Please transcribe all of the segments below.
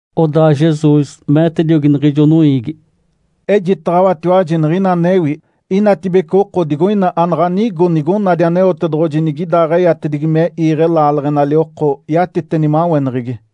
Odaa Jesus meetediogi niɡ̶ijo noiigi, “Ejitaɡ̶awatiwaji niɡ̶ina anewi. Inatibece oko digoina anaɡ̶a nigo nigonadi Aneotedoɡ̶oji nigidaaɡ̶eyatedigi me iiɡ̶e laaleɡ̶enali oko yatite nimaweneɡ̶egi.”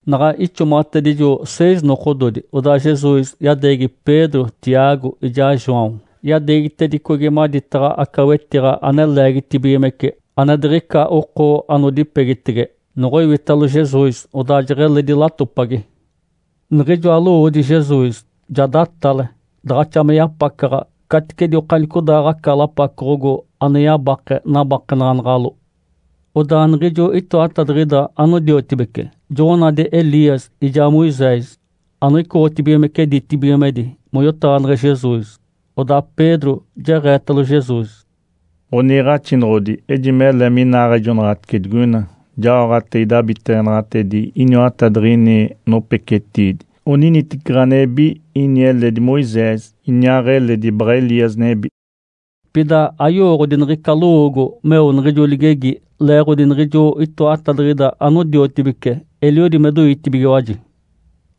Naɡ̶a ixomaɡ̶atedijo seis nokododi, odaa Jesus yadeegi Pedro, Tiago ijaa João. Yadeegitedicogi maditaɡ̶a aca wetiɡ̶a ane leegitibigimece ane diɡ̶ica oko anodipegitege. Noɡ̶oiwitalo Jesus, odaa jeɡ̶eledi latopagi. Niɡ̶ijoa lowoodi Jesus ja datale, daɡ̶axa me yapacaɡ̶a, caticedi okanicodaaɡ̶aca lapacoɡ̶ogo ane yabake nabakenaɡ̶anaɡ̶alo. Odaa niɡ̶ijo itoatadiɡ̶ida anodiotibece joɡ̶onadi Elias ijaa Moisés anoicoɡ̶otibigimece ditibigimedi moyotaɡ̶aneɡ̶e Jesus. Odaa Pedro jeɡ̶eetalo Jesus, “Ǥoniiɡ̶axinoɡ̶odi, ejimele minaaɡ̶ejonaɡ̶atice digoina. Jaoɡ̶ate idabiteɡ̶enaɡ̶atedi iniwatadiɡ̶ini nopecetiidi, oniniteci ɡ̶anebi, ini eledi Moisés, iniaaɡ̶eledi baɡ̶a Elias nebi.” Pida ayowooɡ̶odi niɡ̶ica lowoogo meo niɡ̶ijo ligegi, leeɡ̶odi niɡ̶ijo itoatadiɡ̶ida anodiotibece eliodi me doitibigiwaji.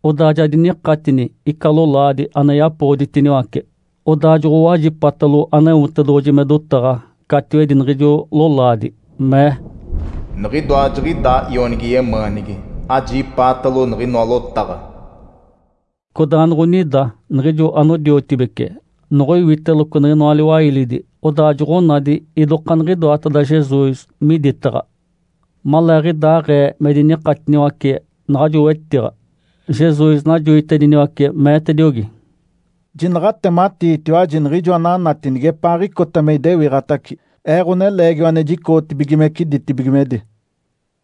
Odaa ja dinikatini ica lolaadi ane yapoɡ̶oditiniwace, odaa joɡ̶owajipatalo Aneotedoɡ̶oji me dotaɡ̶a catiwedi niɡ̶ijo lolaadi, mee, “Niɡ̶idoa jiɡ̶idaa Ionigi yemaanigi. Ajipaatalo niɡ̶inoa lotaɡ̶a!” Codaa noɡ̶onida niɡ̶ijo anodiotibece noɡ̶oiwiteloco niɡ̶inoa liwailidi, odaa joɡ̶onadi idokaaniɡ̶inoateda Jesus miditaɡ̶a. Maleeɡ̶idaaɡ̶ee me dinikatiniwace naɡ̶ajo wetiɡ̶a, Jesus najoitediniwace, meetediogi, “Jinaɡ̶a atematiitiwaji niɡ̶ijo ananati nigepaaɡ̶icota me idewiɡ̶atace Ee, Ǥoneleegiwa ane jicoɡ̶otibigimece ditibigimedi.”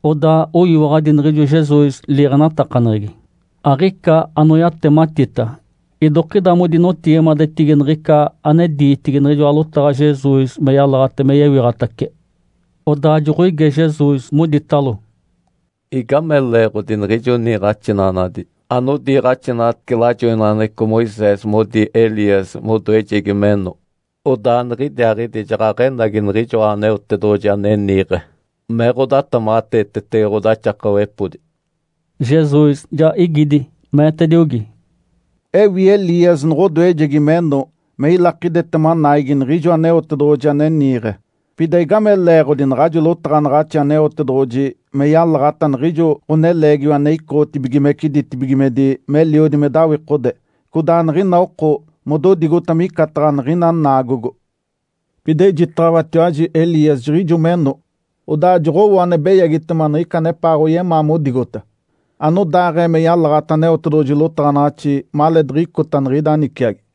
Odaa oyiwaɡ̶adi niɡ̶ijo Jesus liiɡ̶enatakaneɡ̶egi, aɡ̶ica anoyatematita. Idokida modinotigimadetigi niɡ̶ica ane diitigi niɡ̶ijoa lotaɡ̶a Jesus me yalaɡ̶ate me yewiɡ̶atace. Odaa joɡ̶oige Jesus, moditalo, “Igame leeɡ̶odi niɡ̶ijo niiɡ̶axinaɡ̶anadi anodiiɡ̶axinaɡ̶atece lajoinaɡ̶aneɡ̶eco Moisés modi Elias modoejegi meno, odaa nigidiaaɡ̶idi jaɡ̶aɡ̶enagi Niɡ̶ijoa Aneotedoɡ̶oji ane niiɡ̶e me ɡ̶odatamaɡ̶ateetege ɡ̶odaxakawepodi?” Jesus ja igidi, meetediogi, “Ewi Elias noɡ̶odoejegi meno me ilakidetema naigi Niɡ̶ijo Aneotedoɡ̶oji ane niiɡ̶e. Pida igame leeɡ̶odi naɡ̶ajo lotaɡ̶anaɡ̶axi Aneotedoɡ̶oji me yalaɡ̶ata niɡ̶ijo Ǥoneleegiwa ane icoɡ̶otibigimece ditibigimedi meliodi me dawikode, codaa niɡ̶ina oko mododigota micataɡ̶a niɡ̶ina naagogo? Pida ejitaɡ̶awatiwaji Elias jiɡ̶ijo meno, odaa joɡ̶owo ane beyagitema niɡ̶ica anepaaɡ̶oyemaa modigota, anodaaɡ̶ee me yalaɡ̶ata Aneotedoɡ̶oji lotaɡ̶anaɡ̶axi maleediɡ̶icota niɡ̶ida niciagi.”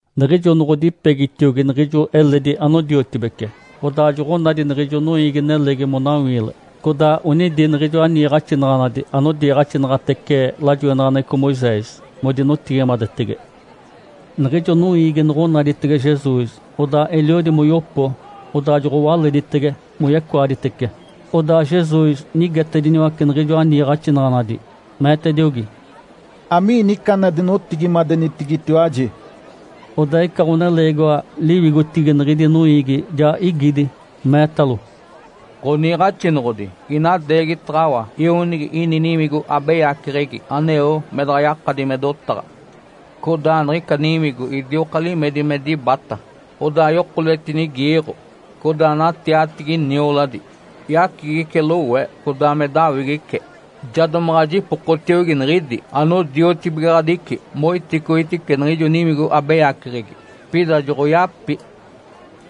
Niɡ̶ijo noɡ̶odipegitiogi niɡ̶ijo eledi anodiotibece, odaa joɡ̶onadi niɡ̶ijo noiigi-nelegi monawiile. Codaa onidi niɡ̶ijoa niiɡ̶axinaɡ̶anadi anodiiɡ̶axinaɡ̶atece lajoinaɡ̶aneɡ̶eco Moisés modinotigimadetege. Niɡ̶ijo noiigi noɡ̶onaditege Jesus, odaa eliodi moyopo, odaa joɡ̶owaleditege moyecoaditece. Odaa Jesus nigetediniwace niɡ̶ijoa niiɡ̶axinaɡ̶anadi, meetediogi, “Amiini ica ane adinotigimadenitigitiwaji?” Odaa ica ɡ̶oneleegiwa liwigotigi niɡ̶idi noiigi ja igidi, meetalo, “Ǥoniiɡ̶axinoɡ̶odi, inadeegitaɡ̶awa ionigi ini niwigo abeyaceɡ̶egi aneo me daɡ̶a yakadi me dotaɡ̶a. Codaa niɡ̶ica niwigo idioka limedi me dibata, odaa yokoletinigiiɡ̶o. Codaa natiatigi nioladi, yacigice lowe, codaa me dinawigice. Ja domaɡ̶a jipokotiogi niɡ̶idi anodiotibigaɡ̶adici moiticoitice niɡ̶ijo niwigo abeyaceɡ̶egi, pida joɡ̶oyapi.”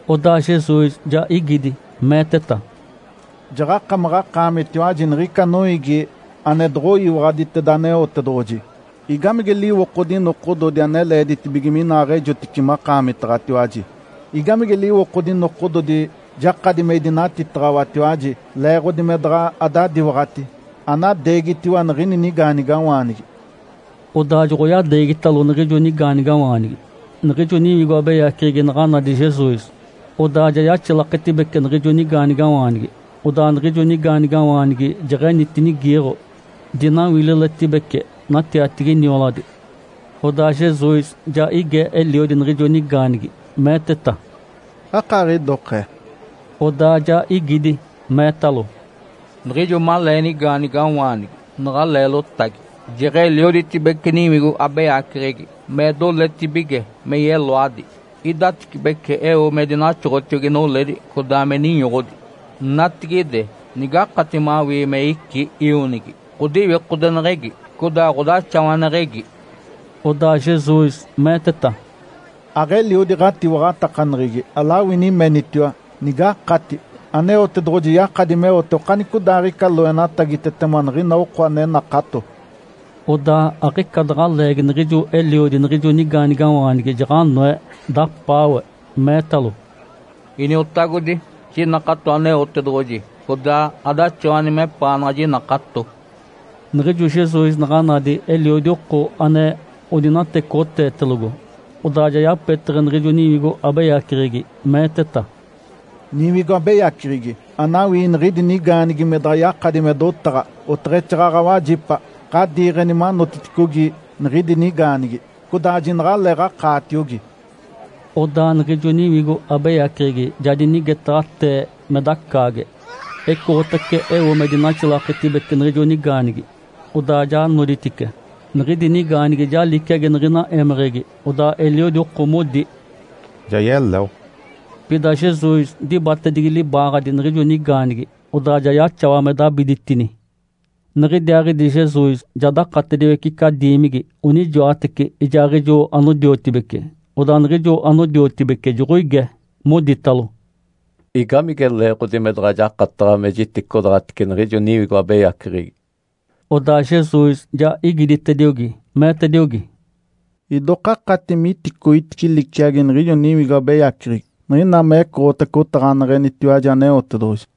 Odaa Jesus ja igidi, meeteta, “Jaɡ̶akamaɡ̶akaamitiwaji niɡ̶ica noiigi ane doɡ̶oyiwaɡ̶aditeda Aneotedoɡ̶oji. Igamige liwokodi nokododi ane leeditibige minaaɡ̶ejotice makaamitaɡ̶atiwaji? Igamige liwokodi nokododi jakadi me idinatitaɡ̶awatiwaji leeɡ̶odi me daɡ̶a adadiwaɡ̶ati? Anadeegitiwa niɡ̶ini nigaanigawaanigi!” Odaa joɡ̶oyadeegitalo niɡ̶ijo nigaanigawaanigi. Niɡ̶ijo niwigo abeyaceɡ̶egi naɡ̶a nadi Jesus, odaa ja yaxilaketibece niɡ̶ijo nigaanigawaanigi, odaa niɡ̶ijo nigaanigawaanigi jeɡ̶enitinigiiɡ̶o, dinawililetibece, natiatigi nioladi. Odaa Jesus ja ige eliodi niɡ̶ijo nigaanigi, meeteta, “Akaaɡ̶idokee?” Odaa ja igidi, meetalo, “Niɡ̶ijo malee nigaanigawaanigi naɡ̶a leelotagi. Jeɡ̶elioditibece niwigo abeyaceɡ̶egi me doletibige me yeloadi, idatecibece eo me dinaxoɡ̶otiogi noledi codaa me ninyoɡ̶odi. Natigide nigakati mawii me icí ionigi, ɡ̶odiwikodeneɡ̶egi, codaa ɡ̶odaxawaneɡ̶egi!” Odaa Jesus meeteta, “Aɡ̶eliodi ɡ̶atiwaɡ̶atakaneɡ̶egi alawini menitiwa, ‘Nigakati’. Aneotedoɡ̶oji yakadi meote okanicodaaɡ̶ica loenatagitetema niɡ̶ina oko ane nakato.” Odaa aɡ̶ica daɡ̶a leegi niɡ̶ijo eliodi niɡ̶ijo nigaanigawaanigi jaɡ̶anoe, dapaawe, meetalo, “Iniotagodi, jinakato Aneotedoɡ̶oji, codaa adaxawani mepaanaɡ̶a jinakato!” Niɡ̶ijo Jesus naɡ̶a nadi eliodi oko ane odinatecoɡ̶oteetelogo, odaa ja yapeteɡ̶e niɡ̶ijo niwigo abeyaceɡ̶egi, meeteta, “Niwigo abeyaceɡ̶egi anawii niɡ̶idi nigaanigi me daɡ̶a yakadi me dotaɡ̶a oteɡ̶exaaɡ̶aɡ̶a wajipa, ɡ̶adiiɡ̶eni manotiticogi niɡ̶idi nigaanigi, codaa jinaɡ̶aleeɡ̶akaatiogi!” Odaa niɡ̶ijo niwigo abeyaceɡ̶egi ja dinigetaɡ̶atee me dacaage, ecoɡ̶otace eo me dinaxilaketibece niɡ̶ijo nigaanigi, odaa ja noditice. Niɡ̶idi nigaanigi ja liciagi niɡ̶ina émeɡ̶egi, odaa eliodi oko modi, “Ja yeleo!” Pida Jesus dibatedigi libaaɡ̶adi niɡ̶ijo nigaanigi, odaa ja yaxawa me dabiditini. Niɡ̶idiaaɡ̶idi Jesus ja dakatediwece ica diimigi, onijoateci ijaaɡ̶ijo anodiotibece, odaa niɡ̶ijo anodiotibece joɡ̶oige, moditalo, “Igamige leeɡ̶odi me daɡ̶a jakataɡ̶a me jiticodaɡ̶atice niɡ̶ijo niwigo abeyaceɡ̶egi?” Odaa Jesus ja igiditediogi, meetediogi, “Idoka akati miticoitice liciagi niɡ̶ijo niwigo abeyaceɡ̶egi niɡ̶ina mecoɡ̶otace otaɡ̶aneɡ̶enitiwaji Aneotedoɡ̶oji.”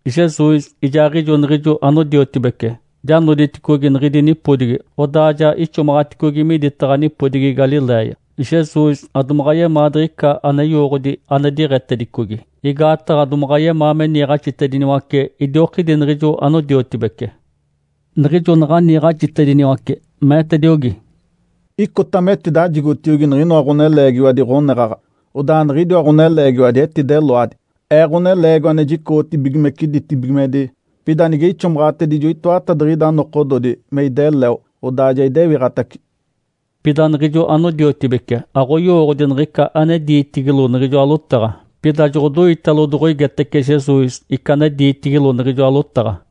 Jesus ijaaɡ̶ijo niɡ̶ijo anodiotibece ja noditicogi niɡ̶idi nipodigi, odaa ja ixomaɡ̶aticogi miditaɡ̶a nipodigi Galiléia. Jesus adomaɡ̶a yemaa diɡ̶ica ane yowooɡ̶odi ane diɡ̶etedicogi, igaataɡ̶a domaɡ̶a yemaa me niiɡ̶axitediniwace idiokidi niɡ̶ijo anodiotibece. Niɡ̶ijo naɡ̶a niiɡ̶axitediniwace, meetediogi, “Icota metidajigotiogi niɡ̶inoa ɡ̶oneleegiwadi ɡ̶oneɡ̶aɡ̶a, odaa niɡ̶idiwa ɡ̶oneleegiwadi etideloadi, Ee, Ǥoneleegiwa ane jicoɡ̶otibigimece ditibigimedi. Pida nige ixomaɡ̶atedijo itoatadiɡ̶ida nokododi me ideleo, odaa ja idewiɡ̶atace.” Pida niɡ̶ijo anodiotibece aɡ̶oyowooɡ̶odi niɡ̶ica ane diitigilo niɡ̶ijoa lotaɡ̶a. Pida joɡ̶odoitalo doɡ̶oigetece Jesus ica ane diitigilo niɡ̶ijoa lotaɡ̶a.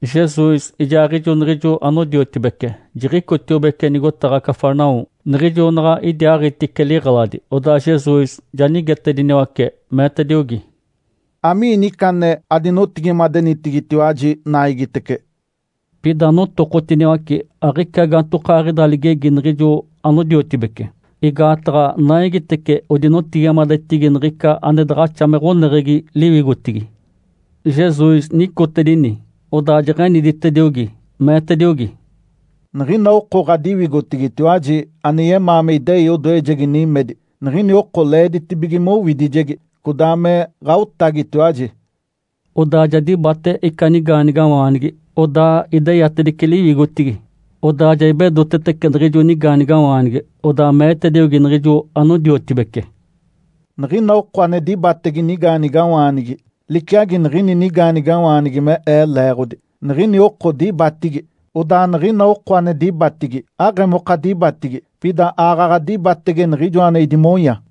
Jesus ijaaɡ̶ijo niɡ̶ijo anodiotibece jiɡ̶icotiobece nigotaɡ̶a Cafarnaum. Niɡ̶ijo naɡ̶a idiaaɡ̶itice liɡ̶eladi, odaa Jesus ja nigetediniwace, meetediogi, “Amiini ica ane adinotigimadenitigitiwaji naigitece?” Pida notokotiniwace, aɡ̶ica gaantokaaɡ̶ida ligegi niɡ̶ijo anodiotibece, igaataɡ̶a naigitece odinotigimadetigi niɡ̶ica ane daɡ̶axa me ɡ̶oneɡ̶egi liwigotigi. Jesus nicotedini, odaa jeɡ̶eniditediogi, meetediogi, “Niɡ̶ina oko ɡ̶adiwigotigitiwaji ane yemaa me idei odoejegi nimedi, niɡ̶ini oko leeditibige mowidijegi, codaa me ɡ̶aotagitiwaji.” Odaa ja dibate ica nigaanigawaanigi, odaa ideyatedice liwigotigi. Odaa ja ibedotetece niɡ̶ijo nigaanigawaanigi, odaa meetediogi niɡ̶ijo anodiotibece, “Niɡ̶ina oko ane dibatege nigaanigawaanigi liciagi niɡ̶ini nigaanigawaanigi me Ee leeɡ̶odi, niɡ̶ini oko dibatigi. Odaa niɡ̶ina oko ane dibatigi, aɡ̶emoka dibatigi, pida aaɡ̶aɡ̶a dibatege Niɡ̶ijoa ane idimonya.”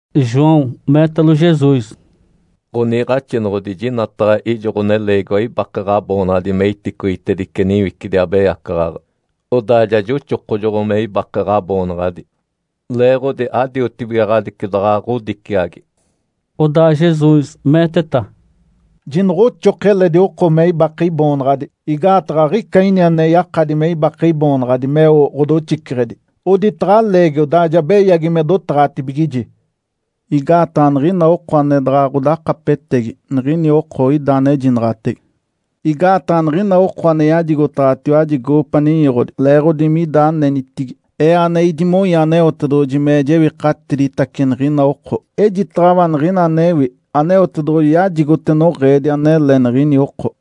João meetalo Jesus, “Ǥoniiɡ̶axinoɡ̶odi, jinataɡ̶a ijo ɡ̶oneleegiwa ibake Ǥaboonaɡ̶adi me iticoitedice niwicidi abeyacaɡ̶aɡ̶a, odaa ja joxokojoɡ̶o me ibake Ǥaboonaɡ̶adi, leeɡ̶odi adiotibigaɡ̶adici daɡ̶a ɡ̶odiciagi.” Odaa Jesus meeteta, “Jinoɡ̶oxoki eledi oko me ibake Iboonaɡ̶adi, igaataɡ̶a aɡ̶ica ini ane yakadi me ibake Iboonaɡ̶adi meo ɡ̶odoxiceɡ̶edi, oditaɡ̶a aleegi odaa ja beyagi me dotaɡ̶atibigiji. Igaataɡ̶a niɡ̶ina oko ane daɡ̶a ɡ̶odakapetegi, niɡ̶ini oko ida anejinaɡ̶atege. Igaataɡ̶a niɡ̶ina oko ane yajigotaɡ̶awatiwaji goopa ninyoɡ̶odi leeɡ̶odi mida anenitigi, Ee ane idimonya Aneotedoɡ̶oji me jewikatiditace niɡ̶ina oko. Ejitaɡ̶awa niɡ̶ina anewi, Aneotedoɡ̶oji yajigote noɡ̶eedi anele niɡ̶ini oko.”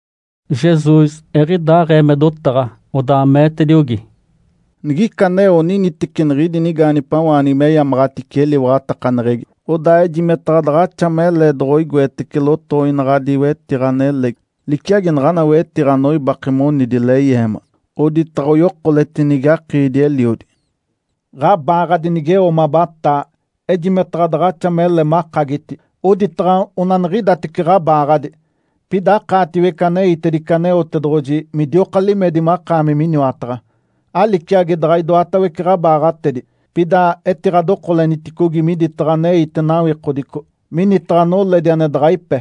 Jesus eɡ̶idaaɡ̶ee me dotaɡ̶a, odaa meetediogi, “Nigica aneo oniniteci niɡ̶idi nigaanigipawaanigi meyamaɡ̶atice eliwaɡ̶atakaneɡ̶egi, odaa ejimetaɡ̶a daɡ̶axa mele doɡ̶oigoetece lotoinaɡ̶adi wetiɡ̶a nelegi liciagi naɡ̶ana wetiɡ̶a anoibake monidi leyeema, oditaɡ̶a oyokoletinigi akiidi-eliodi. Ǥabaaɡ̶adi nigeo mabataa, ejimetaɡ̶a daɡ̶axa mele makagiti, oditaɡ̶a onaniɡ̶idatece ɡ̶abaaɡ̶adi, pida akaatiwece aneitedice Aneotedoɡ̶oji midioka limedi makaami miniwataɡ̶a. Aliciagi daɡ̶a idoatawece ɡ̶abaaɡ̶atedi, pida etiɡ̶adokoleniticogi miditaɡ̶a aneite nawikodico minitaɡ̶a noledi ane daɡ̶a ipe.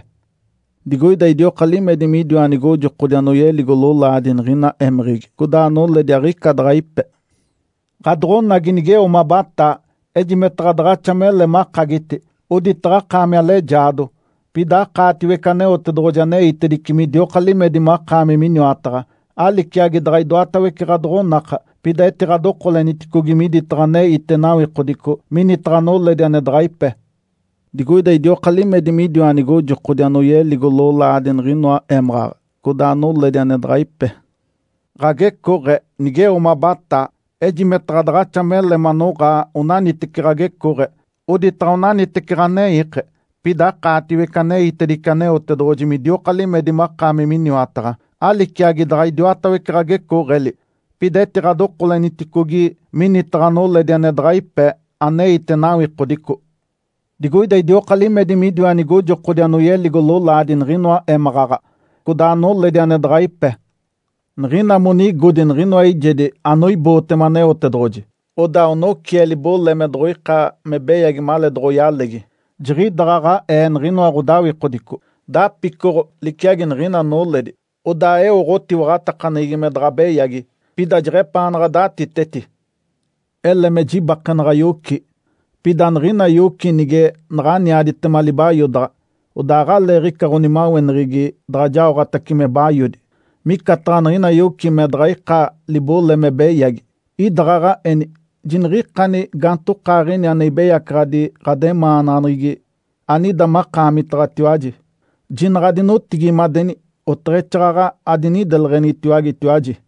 Digoida idioka limedi midiwa nigojokodi anoyeligo lolaadi niɡ̶ina émeɡ̶egi, codaa noledi aɡ̶ica daɡ̶a ipe. Ǥadoɡ̶onagi nigeo mabataa, ejimetaɡ̶a daɡ̶axa mele makagiti, oditaɡ̶a akaami alejaado, pida akaatiwece Aneotedoɡ̶oji aneitedice midioka limedi makaami miniwataɡ̶a. Aliciagi daɡ̶a idoatawece ɡ̶adoɡ̶onaka, pida etiɡ̶adokoleniticogi miditaɡ̶a aneite nawikodico minitaɡ̶a noledi ane daɡ̶a ipe. Digoida idioka limedi midiwa nigojokodi anoyeligo lolaadi niɡ̶inoa émaɡ̶aɡ̶a, codaa noledi ane daɡ̶a ipe. Ǥagecooɡ̶e nigeo mabataa, ejimetaɡ̶a daɡ̶axa mele manoɡ̶aa onaniteci ɡ̶agecooɡ̶e, oditaɡ̶a onaniteci ɡ̶aneike, pida akaatiwece aneitedice Aneotedoɡ̶oji midioka limedi makaami miniwataɡ̶a. Aliciagi daɡ̶a idiwatawece ɡ̶agecooɡ̶eli, pida etiɡ̶adokoleniticogi minitaɡ̶a noledi ane daɡ̶a ipe, aneite nawikodico. Digoida idioka limedi midiwa nigojokodi anoyeligo lolaadi niɡ̶inoa émaɡ̶aɡ̶a, codaa noledi ane daɡ̶a ipe. Niɡ̶ina monigodi niɡ̶inoa eijedi anoibootema Aneotedoɡ̶oji, odaa onocie libole me doɡ̶oika me beyagi maleedoɡ̶oyalegi, jiɡ̶idaɡ̶aɡ̶aee niɡ̶inoa ɡ̶odawikodico, dapicoɡ̶o liciagi niɡ̶ina noledi, odaa eo ɡ̶otiwaɡ̶atakaneɡ̶egi me daɡ̶a beyagi, pida jeɡ̶epaanaɡ̶a datiteti. Ele me jibakenaɡ̶a yoci, pida niɡ̶ina yoci nige naɡ̶aniaditema libayodaɡ̶a, odaa aɡ̶aleeɡ̶ica ɡ̶onimaweneɡ̶egi daɡ̶a jaoɡ̶atace me bayodi. Micataɡ̶a niɡ̶ina yoci me daɡ̶a ika libole me beyagi, idaɡ̶aɡ̶aeni jiniɡ̶ikani gaantokaaɡ̶ini ane ibeyacaɡ̶adi ɡ̶ademaanaɡ̶aneɡ̶egi anida makaamitaɡ̶atiwaji, jinaɡ̶a adinotigimadeni, oteɡ̶exaaɡ̶aɡ̶a adinideleɡ̶enitiwagetiwaji.”